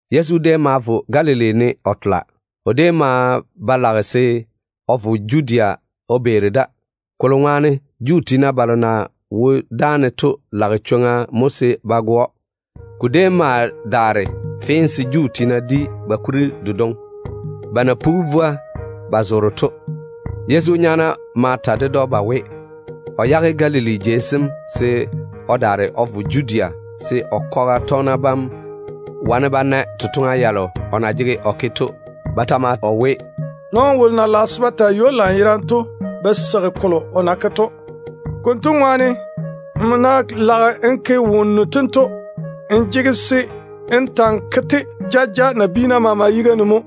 Yezu déem maa wo Galili ne o beera. O déem maa ba lage se o vo Judea o beeri da, kolo ŋwaane Juu tiina balo na wo dáane to lage chwoŋa mo se ba go‑o. Ko déem ma daare fee se Juu tiina di ba kuri delo yere na ye ‘Vwoa chwiim kuri’ to. Yezu nyaana ma ta ded‑o ba we, o yage Galili jei sem se o daare o vo Judea se o kwaga tɔgena bam wane ba na totoŋa yalo o na jege o ke to. Ba ta maa we, “Nɔɔno wolo na lage se o yere zaŋe jei maama ne to ba seigi kolo o na ke to. Konto ŋwaane, nmo ná lage n ke wonnu tento, n jege se n ta‑n ke-te jaja nabiina maama yiga ne mo,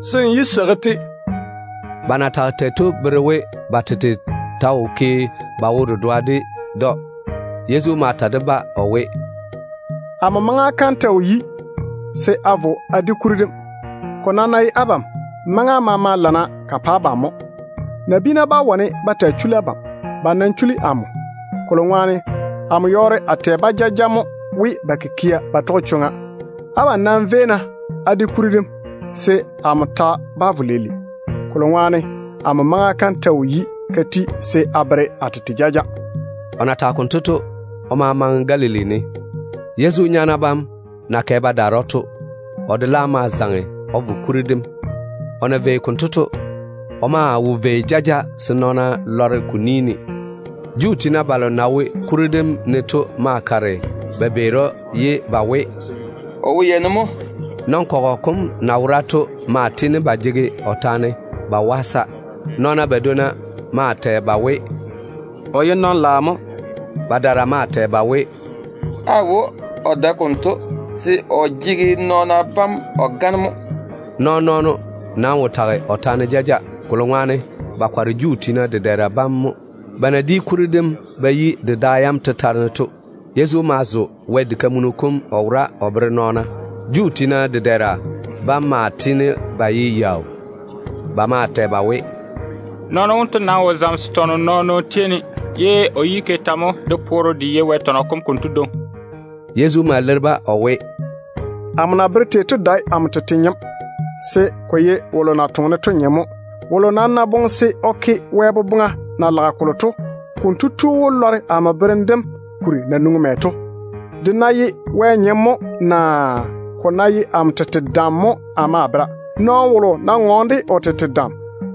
se n yé seigi-te.” Ba na tage tei to bere we ba tete ta wo ke ba wo-dedoa ded‑o. Yezu ma ta de-ba o we, “Amo maŋa kam ta wo yi se a vo a di kuri dem. Ko nam ná ye abam, maŋa maama lana ka pa abam mo. Nabiina bá wane ba taa chuli abam. Ba nam chuli amo, kolo ŋwaane amo yɔɔre a tɛ-ba jaja mo we ba kikia ba tɔge chwoŋa. Abam nam véi-na á di kuri dem, se amo ta bá vo leile, kolo ŋwaane amo maŋa kam ta wo yi ka ti se a bere a tete jaja.” O na tage konto to, o ma maŋe Galili ne. Yezu nyaana bam na kɛ ba daare to, o de laam ma zaŋe o vo kuri dem. O na vei konto to, o maa wo vei jaja se nɔɔna lɔre ko ni ne. Juu tiina balo na wo kuri dem ne to maa kare ba beeri‑o ye ba we, “O wo yei ne mo?” Nɔn-kɔgɔ kom na wora to maa tiini ba jege o taane ba waasa. Nɔɔna badwonna maa tɛ ba we, “O ye nɔn-ŋom mo.” Badaara maa tɛ ba we, “Aawo, o dae konto, se o jege nɔɔna bam o gane mo.” Nɔɔn-nɔɔno nam wo tage o taane jaja, ba na kɔre Juu tiina dedɛɛra bam to ŋwaane. Ba na di kuri dem ba yi de da yam tetare to, Yezu laam ma vo o zo Wɛ diga kam o wora o bere nɔɔna. Juu tiina dedɛɛra bam maa tiini ba ye yaau. Ba maa tɛ ba we, “Nɔɔno wonto nam wo zamese tɔnɔ nɔɔn-nɔɔno tei ne, ye o yi ke tɛ mo de poore de yei Wɛ tɔnɔ kom konto dwoŋi?” Yezu ma leiri-ba o we, “Amo na bere tei to dae amo tete nyem, se ko ye wolo na toŋe-ne to nyem mo. Wolo nam ná boŋe se o ke Wɛ boboŋa na lage kolo to, konto tu wó lɔre amo berem dem kuri na nwoŋi mɛ to, de ná ye Wɛ nyem mo naa ko ná ye amo tete dam mo a ma a bera. Nɔɔno wolo ná ŋɔɔne de o tete dam,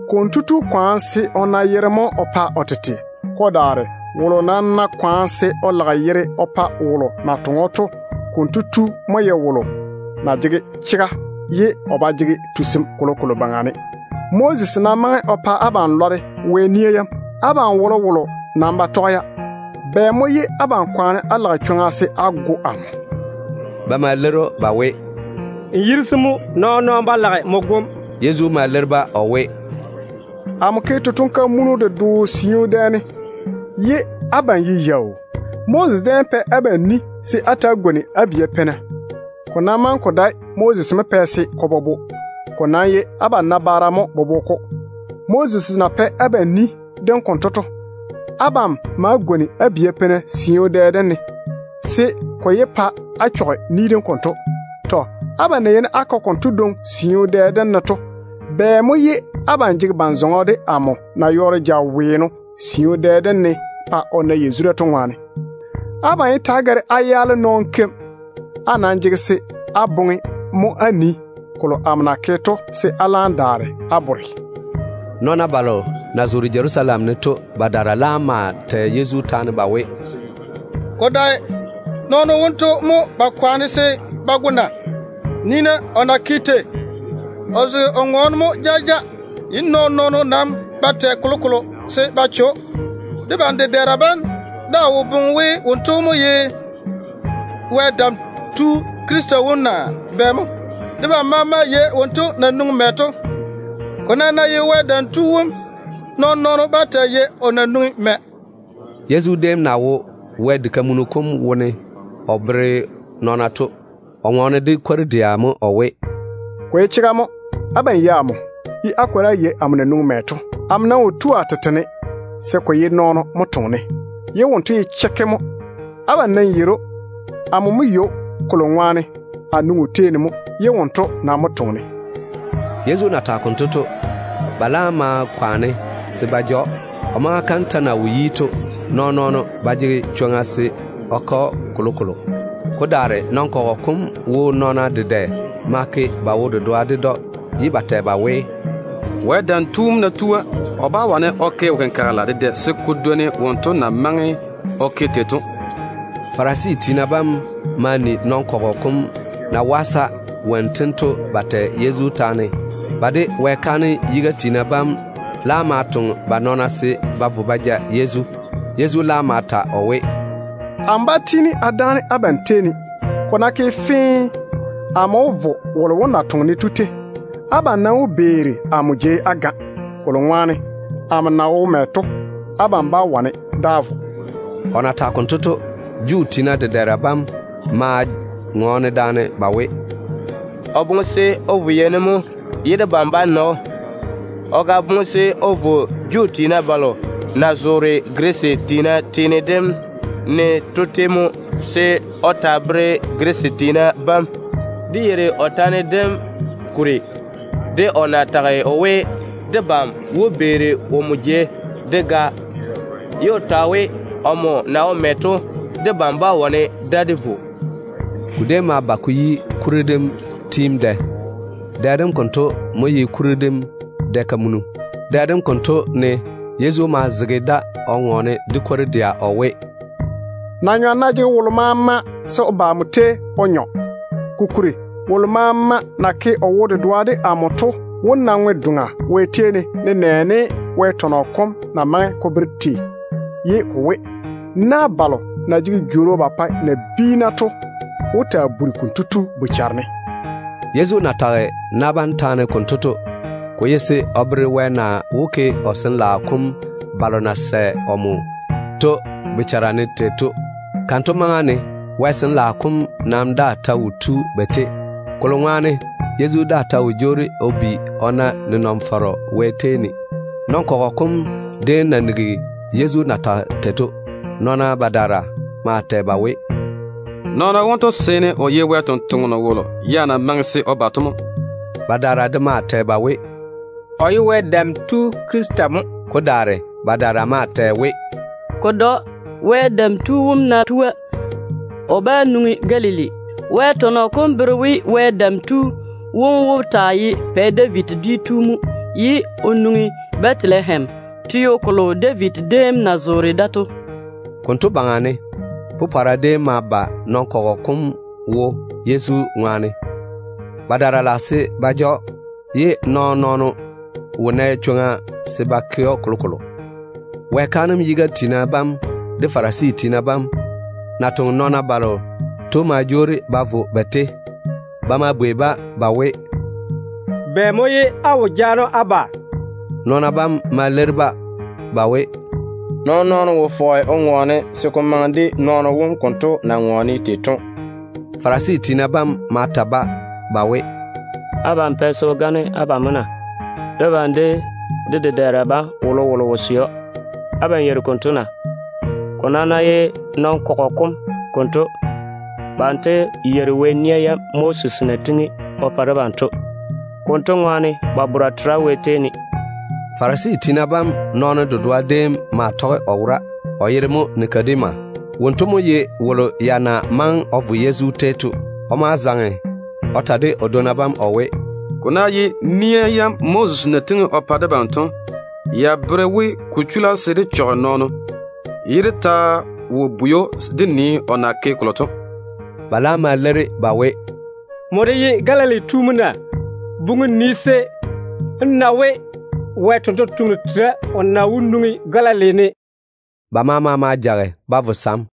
konto tu kwaane se o na yere mo o pa o tete. Ko daare wolo nam ná kwaane se o lage yere o pa wolo na toŋe‑o to, konto tu mo ye wolo na jege chega, ye o ba jege tusim kolokolo baŋa ne. Moses nam maŋe o pa abam lɔre Wɛ nia yam. Abam wolowolo nam ba tɔge-ya. Bɛ mo ye abam kwaane á lage chwoŋa se á go amo?” Ba ma leiri‑o ba we, “N yirisi mo. Nɔɔn-nɔɔno ba lage nmo gom.” Yezu ma leiri-ba o we, “Amo ke totoŋ-kamunu dedoo siu dɛ ne, ye abam ye yaau. Moses déem pɛ abam ni se á ta‑á gwoni á bia peina. Ko nam maŋe ko dae we Moses mo pɛ se ko bobo. Ko nam ye abam nabaara mo bobo-ko. Moses na pɛ abam ni dem konto to, abam wae á gwoni á bia peina siu dɛ dem ne, se ko yé pa á chɔge Wɛ ni dem konto. Abam na jege chwoŋa se á ke konto dwoŋi siu dɛ dem ne to, bɛ mo ye abam jege ban-zɔŋɔ de amo na yɔɔre jaweeno siu dɛ dem ne pa o na yazura to ŋwaane? Abam nam yé ta‑á gare á yaale nɔɔno keim. Á nam jege se á boŋe mo á nii kolo amo na ke to, se á laam daare á bore chega bora.” Nɔɔna balo na zoore Jerusalem ne to badaara laam maa tɛ Yezu taane ba we, “Ko dae nɔɔno wonto mo ba kwaane se ba go na? Nii-na o na ke tei. O zege o ŋɔɔne mo jaja, ye nɔɔn-nɔɔno nam ba tɛ kolokolo se ba che‑o. Debam dedɛɛra bam daa wo boŋe we wonto mo ye Wɛ Dam Tu Krista wom naa bɛ mo? Debam maama yei wonto na nwoŋi mɛ to. Ko nam ná ye Wɛ Dam Tu wom, nɔɔn-nɔɔno bá taa yei o na nwoŋi mɛ.” Yezu déem na wo Wɛ diga kam wone o bere nɔɔna to, o ŋɔɔne de kwor-dɛa mo o we, “Ko ye chega mo, abam yei amo, ye á kwori á yei amo na nwoŋi mɛ to. Amo nam wo tu a tete ne, se ko ye nɔɔno mo toŋe-ne, ye wonto ye chekke mo. Abam nam yeiri‑o. Amo mo yei‑o, kolo ŋwaane a nwoŋi o tei mo, ye wonto nam mo toŋe-ne.” Yezu na tage konto to, ba laam ma kwaane se ba ja‑o. O maŋa kam ta na wo yi to, nɔɔn-nɔɔno wo nɛ chwoŋa se o ke‑o kolokolo. Ko daare nɔn-kɔgɔ kom wo nɔɔna dedɛ ma ke ba wo-dedoa ded‑o, ye ba tɛ ba we, “Wɛ Dam Tu wom ná tua, o bá wane o ke wo-kenkagela dedɛ se ko dwoni wonto na maŋe o ke tei to.” Farisi tiina bam ma ni nɔn-kɔgɔ kom na waasa wonnu tento ba tɛ Yezu taane tei to. Ba de Wɛ kaanem yiga tiina bam laam ma toŋe ba nɔɔna se ba vo ba ja Yezu. Yezu laam ma ta o we, “Amo bá tiini a dáane abam tei ne. Ko ná ke fee, amo wó jwoori a vo wolo wom na toŋe-ne to tei. Abam nam wó beeri amo jei á ga, kolo ŋwaane amo na wo mɛ to, abam bá wane da á vo.” O na tage konto to, Juu tiina dedɛɛra bam maa ŋɔɔne daane ba we, “O boŋe se o vo yei ne mo ye debam bá na‑o? O ga boŋe se o vo Juu tiina balo na zoore Girisi tiina teene dem ne to tei mo, se o taa bere-ba na? Dé yeiri o taane dem kuri de o na tage o we, debam wó beeri omo jei dé ga, ye o ta we, omo na wo mɛ to, debam bá wane da dé vo.” Ko déem ma ba ko yi kuri dem tiim dɛ. Dɛ dem konto mo ye kuri dem dɛ-kamunu. Dɛ dem konto ne Yezu maa zege da o ŋɔɔne de kwor-dɛa o we, “Na-nyɔm ná jege wolo maama, se o ba amo tei o nyɔ. Kokuri, wolo maama na ke o wo-dedoa de amo to wó na ŋwe-doŋa Wɛ tei ne, nenɛɛne Wɛ tɔnɔ kom na maŋe ko bere tei ye ko we, ‘Na balo na jege jworo ba pae nabiina to wó taa buri konto tu bochare ne.’” Yezu na tage na bam taane konto to, ko ye se o bere Wɛ na wó ke o Sin-laao kom balo na sɛ omo to bochara ne tei to mo. Kanto maŋa ne Wɛ Sin-laao kom ya daa ta wo tu ba tei, Yezu daa ta na wo jwoori o bi o na nenɔŋ-fɔrɔ Wɛ tei ne to ŋwaane. Nɔn-kɔgɔ kom déem na nigi Yezu na tage tei to, nɔɔna badaara maa tɛ ba we, “Nɔɔno wonto seene o ye Wɛ ni-jwoŋinu wolo na maŋe se o ba to mo.” Badaara de maa tɛ ba we, “O ye Wɛ Dam Tu Krista mo.” Ko daare ye badaara de tɛ ba we, “Ko dae‑o. Wɛ Dam Tu wom ná tua, o bá nwoŋi Galili. Wɛ tɔnɔ kom bere we, Wɛ Dam Tu wom wó taa ye Pɛ David dwi tu mo ye o nwoŋi Bɛtelehem, teo kolo David déem na zoore da to.” Konto baŋa ne, popɔra déem ma ba nɔn-kɔgɔ kom wo Yezu ŋwaane. Badaara lage se ba ja‑o, ye nɔɔn-nɔɔno nam wo nɛ chwoŋa se kotu ke‑o kolokolo. Wɛ kaanem yiga tiina bam de Farisi tiina bam na toŋe nɔɔna balo to ma jwoori ba vo ba tei. Ba ma bwei-ba ba we, “Bɛ mo ye á wo jaane‑o á ba?” Nɔɔna bam ma leiri-ba ba we, “Nɔɔn-nɔɔno wo fɔge o ŋɔɔne se ko maŋe de nɔɔno wom konto na ŋɔɔne tei to.” Farisi tiina bam ma ta-ba ba we, “Abam pɛ se o gane abam de mo na? Debam de dé dedɛɛra bam wolowolo wo sɛ‑o. Abam yeiri konto na? Ko nam ná ye nɔn-kɔgɔ kom konto, banto yeiri Wɛ nia yam Moses déem na tiŋi o pa debam to. Konto ŋwaane, Wɛ sɔɔlem wo ba yuu ne.” Farisi tiina bam nɔɔno dedoa déem maa tɔge o wora, o yere mo Nikodema. Wonto mo ye wolo ya na maŋe o vo Yezu tei to. O ma zaŋe o ta de o dwonna bam o we, “Ko ná ye Wɛ nia yam Moses na tiŋi o pa debam to, ya bere we ko chula se dé chɔge nɔɔno, ye dé ta wo bwei‑o dé nii o na ke kolo to.” Ba laam ma leiri ba we, “Nmo de ye Galili tu mo na? Buŋi jei maama ne, se nmo wó na we, Wɛ ni-jwoŋinu tera o na wó nwoŋi Galili ne.” [ Ba maama ma jage ba vo ba sam.